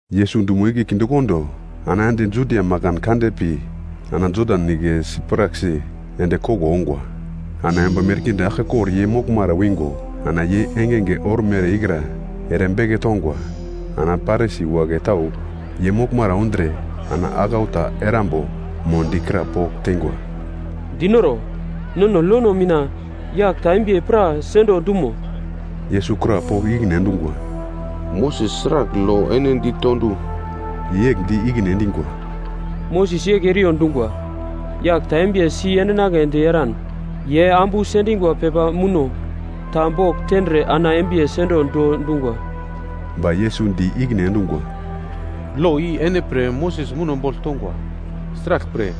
Yesus dumo igle kindekondo, ana ende Judia makan kande pi ana Jodan Nigle sipraksi ende koglo ongwa. Ana yomba merkinde aglkekor ye moglmara wingo ana ye engenge ormere ikra ere beke tongwa. Ana Parisi wagle tau ye moglmara undre ana aglau ta erambo mo di krapogl teingwa, “Dinoro, nono lono mina yagl ta embiye pra sendo dumo?” Yesus krapogl ikine endungwa, “Moses sragl lo ene dito du?” Ye yegl di ikine endingwa, “Moses yegl eriyo dungwa, yagl ta embiye si endinagledi eran, ye ambu sendingwa pepa muno ta bogl tendre ana embiye sendo do dungwa.” Ba Yesus di ikine endungwa, “Lo i ene pre Moses muno bogl tongwa. Sraglpre,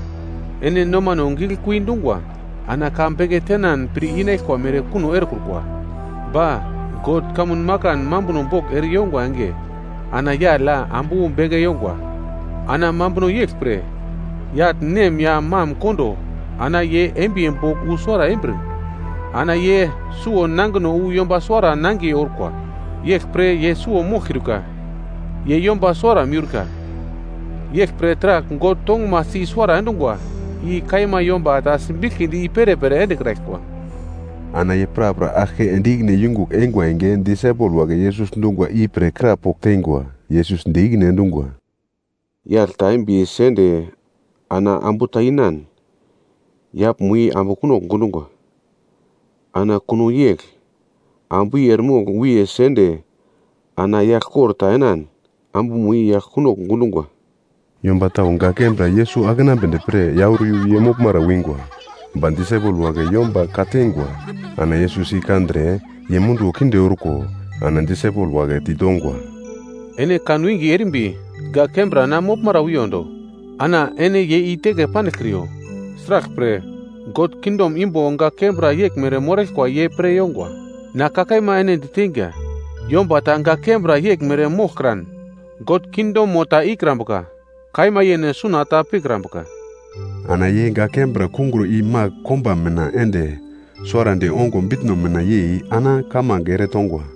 ene nomano giglekui dungwa ana ka beke tenan pir inaglkwa mere kuno erekrukwa. Ba, ‘God kamun makan mambuno bogl ere yongwa enge, ana yagl ya ambu beke yongwa.’ ‘Ana mambuno yeglpre, yagl nem ya mam kondo ana ye embiye bogl wu suwara embir ana ye suwo nangino wu yomba suwara nangiye orkwa. Yeglpre ye suwo moglkiurka, ye yomba suwara miurka. Yeglpre taragl God tongumasi i-suwara endungwa. I kaima yomba ta simbiglkidi i perepere endekraglkwa.” Ana ye prapra aglke ende ikine yungugl eingwa enge, disaipel wagle Yesus dungwa ipre krapogl teingwa. Yesus di ikine endungwa, “Yagl ta embiye sende ana ambu ta inan, yaglmo i ambu kunogl gundungwa. Ana kuno yegl ambu i eremogl wiye sende ana yagl kor ta enan, ambumo i yagl kunogl gundungwa.” Yomba tau gak kembra Yesus akenambedi pre auro iyu ye moglmara wingwa. Ba disaipel wagle yomba ka-teingwa. Ana Yesus i kandre, ye munduwo kinde orko ana disaipelma wagle ditongwa, “Ene kan winge erimbi gak kembra na moglmara wiyondo, ana ene ye i-teke pandiglkriyo. Sraglpre, God kingdom imbo gak kembra yeglmere moraglkwa ye pre yongwa. Na ka kaima ene diteinga, yomba ta gak kembra yeglmere moglkran God kingdomo ta ikrambuka. Kaima yene suna ta pikrambuka.” Ana ye gak kembra kungro i-magl komba mina ende suwarandi ongo bitno mina yei ana kamange ere tongwa.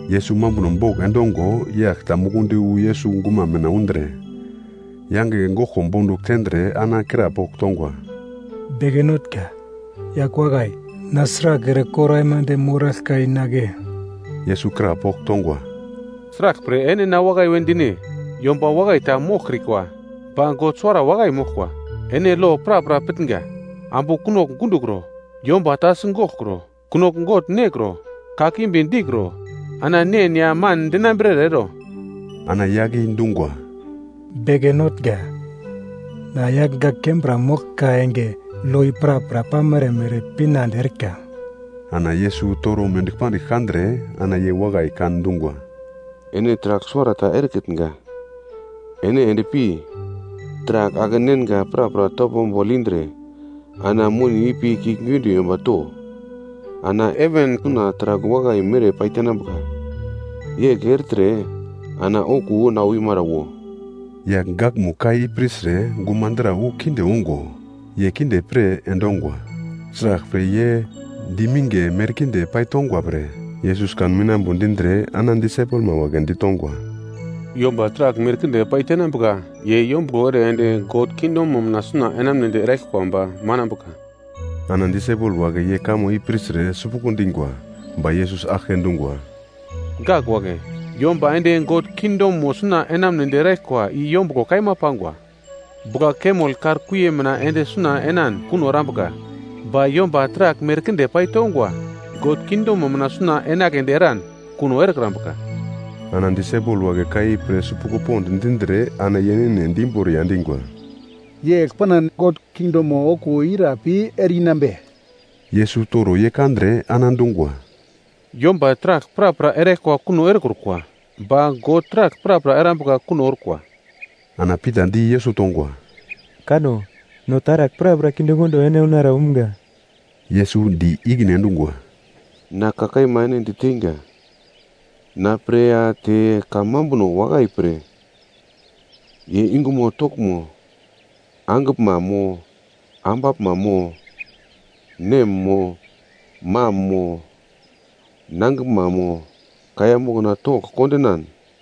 Yesus mambuno bogl endongo yagl ta mukundi wu Yesus guma mina undre, yange goglko bondugl tendre ana krapogl tongwa, “Beke Notnga, yagl wakai, na sragl ere kor aimande moraglka inagle?” Yesus krapogl tongwa, “Sraglpre ene na wakai we dine? Yomba wakai ta moglkrikwa, ba God suwara wakai moglkwa. Ene lo prapra pitnga: ‘Ambu kunogl gundokro, yomba ta sigoglkro, kunogl gogl nekro, kakimbi dikro, ana nen ya man dinambrere ero.’” Ana yagl i dungwa, “Beke Notnga, na yagl gak kembra moglka enge lo i prapra pamere mere pinande erika.” Ana Yesus toro mendigl pandigl kandre ana ye wakai kan dungwa, “Ene taragl suwarata erekitnga, ene endpi, taragl ake-nenga prapra topo bogl indre, ana moni ipi kiuglgiunde yomba to. Ana ene heven suna taragl wakai mere paitenambuka, yegl ertre ana okuwo na wimara wo.” Yagl gakmugl ka i pirtre gumadra wu kinde ongo, ye kinde pir endongwa. Sraglpre, ye diminge merkinde paitongwa pre. Yesus kan winambo dindre ana disaipelma wagle ditongwa, “Yomba taragl merkinde paitenambuka ye yombuglo ere ende God kingdomo mina suna enamunedi eraglkwa ba manambuka.” Ana disaipel wagle ye kamo i pirtre sipuglo dingwa. Ba Yesus aglke dungwa, “Gak wagle, yomba ende God kingdomo suna enamunedi eraglkwa i yombuglo kaima pangwa! Bugla-kamel kar kuiye mina ende suna enan kuno erambuka. Ba yomba taragl merkinde paitongwa God kingdomo mina suna enagledi eran kuno erekrambuka.” Ana disaipel wagle ka i pir sipuglo pond dindre ana ye yene di imboriya endingwa, “Yegl panan God kingdom okuwo ira pi ereinambe?” Yesus toro ye kandre ana dungwa, “Yomba taragl prapra eraglkwa kuno erekrukwa, ba God taragl prapra erambuka kuno orkwa.” Ana Pita di Yesus tongwa, “Kanno, no taragl prapra kindekondo ene unara umga!” Yesus di ikine endungwa, “Na ka kaima ene diteinga, na pre ya te kamambuno wakai pre ye yungumo toglmo mo, angiglma mo ambaglma mo nem mo mam mo nangiglma mo kaiya mokna togl kondinan,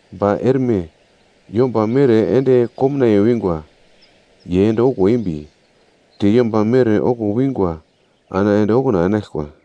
Ba erme yomba mere ende komnaiye wingwa, ye ende okuwo embi, te yomba mere okuwo wingwa ana ende okuna enaglkwa.”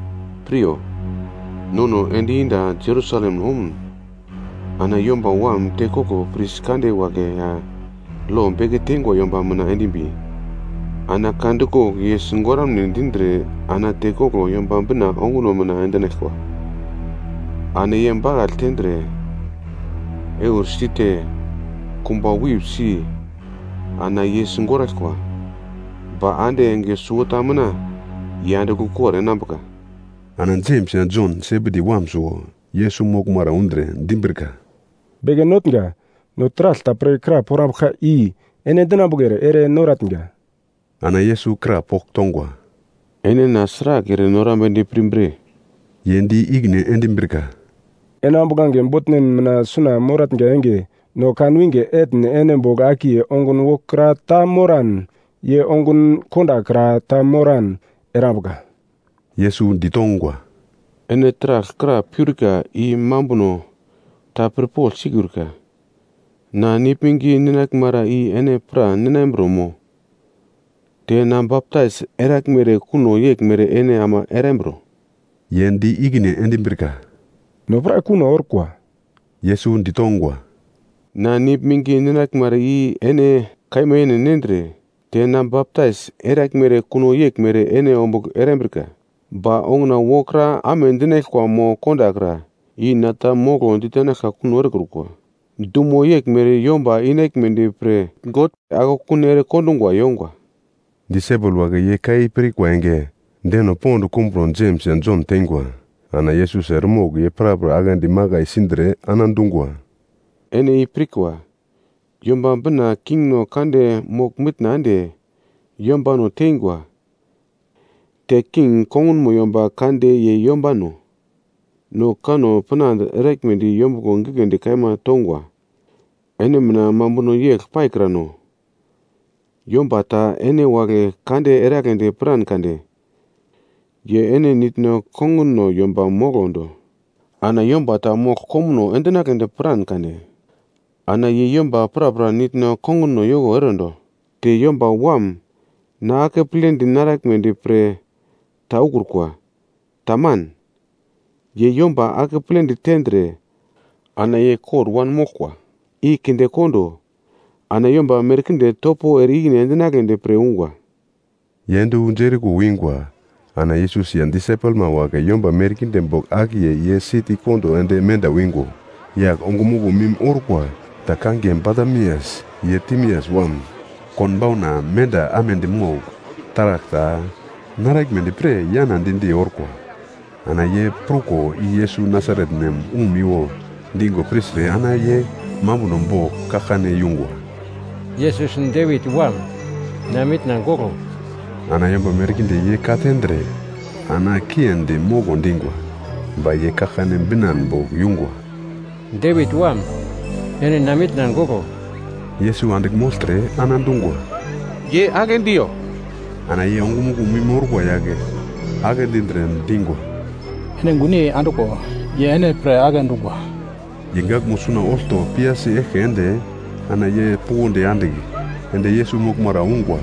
“Piryo, nono ende yenda Jerusalem omun, ana Yomba Wam tekoglo pris kande wagle ya lo beke teingwa yomba mina endimbi, ana ka dikogl ye sigoramune dindre ana tekoglo Yomba Bina onguno mina endinaglkwa. Ana ye bakagl tendre, eursi te, kumba wip si ana ye sigoraglkwa. Ba ande enge suwota mina ye andigl ukor enambuka.” Ana Jems ya Jon, Sebedi wam suwo Yesus moglmara undre dimbrika, “Beke Notnga, no taragl ta pre kra porambuglka i ene dinambuglere ere noratnga.” Ana Yesus krapogl tongwa, “Ene na sragl ere norambedi pirmbre?” Ye di ikine endimbrika, “Ene ambuglange botnen mina suna moratnga enge, no kanwinge etn ene bogl akiye ongun wokra ta moran ye ongun kondakra ta moran erambuglka.” Yesus ditongwa, “Ene taragl kra peurka i mambuno ta pirpogl sikiurka. Na nigl mingi ninaglmara i ene pra ninambro mo? Te na baptais eraglmere kuno yeglmere ene ama erambro?” Ye di ikine endimbrika, “No pra kuno orkwa.” Yesus ditongwa, “Na nigl mingi ninaglmara i ene kaima yene nendre, te na baptais eraglmere kuno yeglmere ene ombugl erambrika, ba onguna wokra amedinaglkwa mo kondakra, i na ta moglo ditenaglka kuno erekrukwa. Dumo yeglmere yomba inaglmedi pre God akekun ere kondungwa yongwa.” Disaipel wagle ye ka i pirkwa enge, deno pond kumbro Jems ya Jon teingwa. Ana Yesus eremogl ye prapra aglendi makai sindre ana dungwa, “Ene i pirkwa, Yomba Bina kingno kande mogl-mitna ende yombano teingwa. Te king kongunmo yomba kande ye yombano no kanno pinande eraglmedi yombuglo gigledi kaima tongwa. Ene mina mambuno yegl paikrano. Yomba ta ene wagle kande eragledi piran kade, ye ene nitno konguno yomba moglo do. Ana yomba ta mogl komuno endinagledi piran kade, ana ye yomba prapra nitno konguno yoko erondo. Te Yomba Wam na akepledi naraglmedi pre ta ukrukwa. Taman, ye yomba akepledi tendre ana ye kor wanmoglkwa i kindekondo, ana yomba merkinde topo ere i-ikine endinagledi pre ungwa.” Ye ende wu Jeriko wingwa, ana Yesus ya disaipelma wagle yomba merkinde bogl akiye ye siti kondo ende menda wingo, yagl ongumuglo mim orkwa ta kangiye Batimias, ye Timias wam, konbauna menda amedi mogl taragl ta naraglmedi pre yana di-di orkwa. Ana ye pruko i Yesus Nasaret nem umiwo dingo pirtre ana ye mambuno bogl kaglkane yungwa, “Yesus Devit Wam, na mitna goglo!” Ana yomba merkinde ye katendre ana kiendi moglo dingwa. Ba ye kaglkane binan bogl yungwa, “Devit Wam, ene na mitna goglo!” Yesus andigl mogltre ana dungwa, “Ye agle diyo.” Ana ye ongumuglo mim orkwa yagle agle dindre, dingwa, “Ene gunyei andiglo. Ye ene pre agle dungwa.” Ye gaglmo suna olto piyasi eglke ende ana ye puglondi andigl, ende Yesus moglmara ungwa.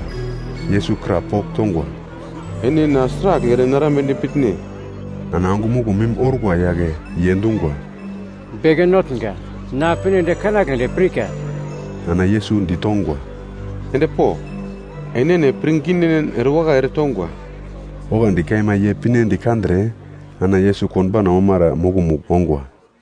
Yesus krapogl tongwa, “Ene na sragl ere narambedi pitne?” Ana ongumuglo mim orkwa yagle ye dungwa, “Beke Notnga, na pinedi kanagledi pirka.” Ana Yesus ditongwa, “Endpo, enene pirnginen erewakai ere tongwa.” Oglandi kaima ye pinedi kandre ana Yesus konbauna omara mokomugl ongwa.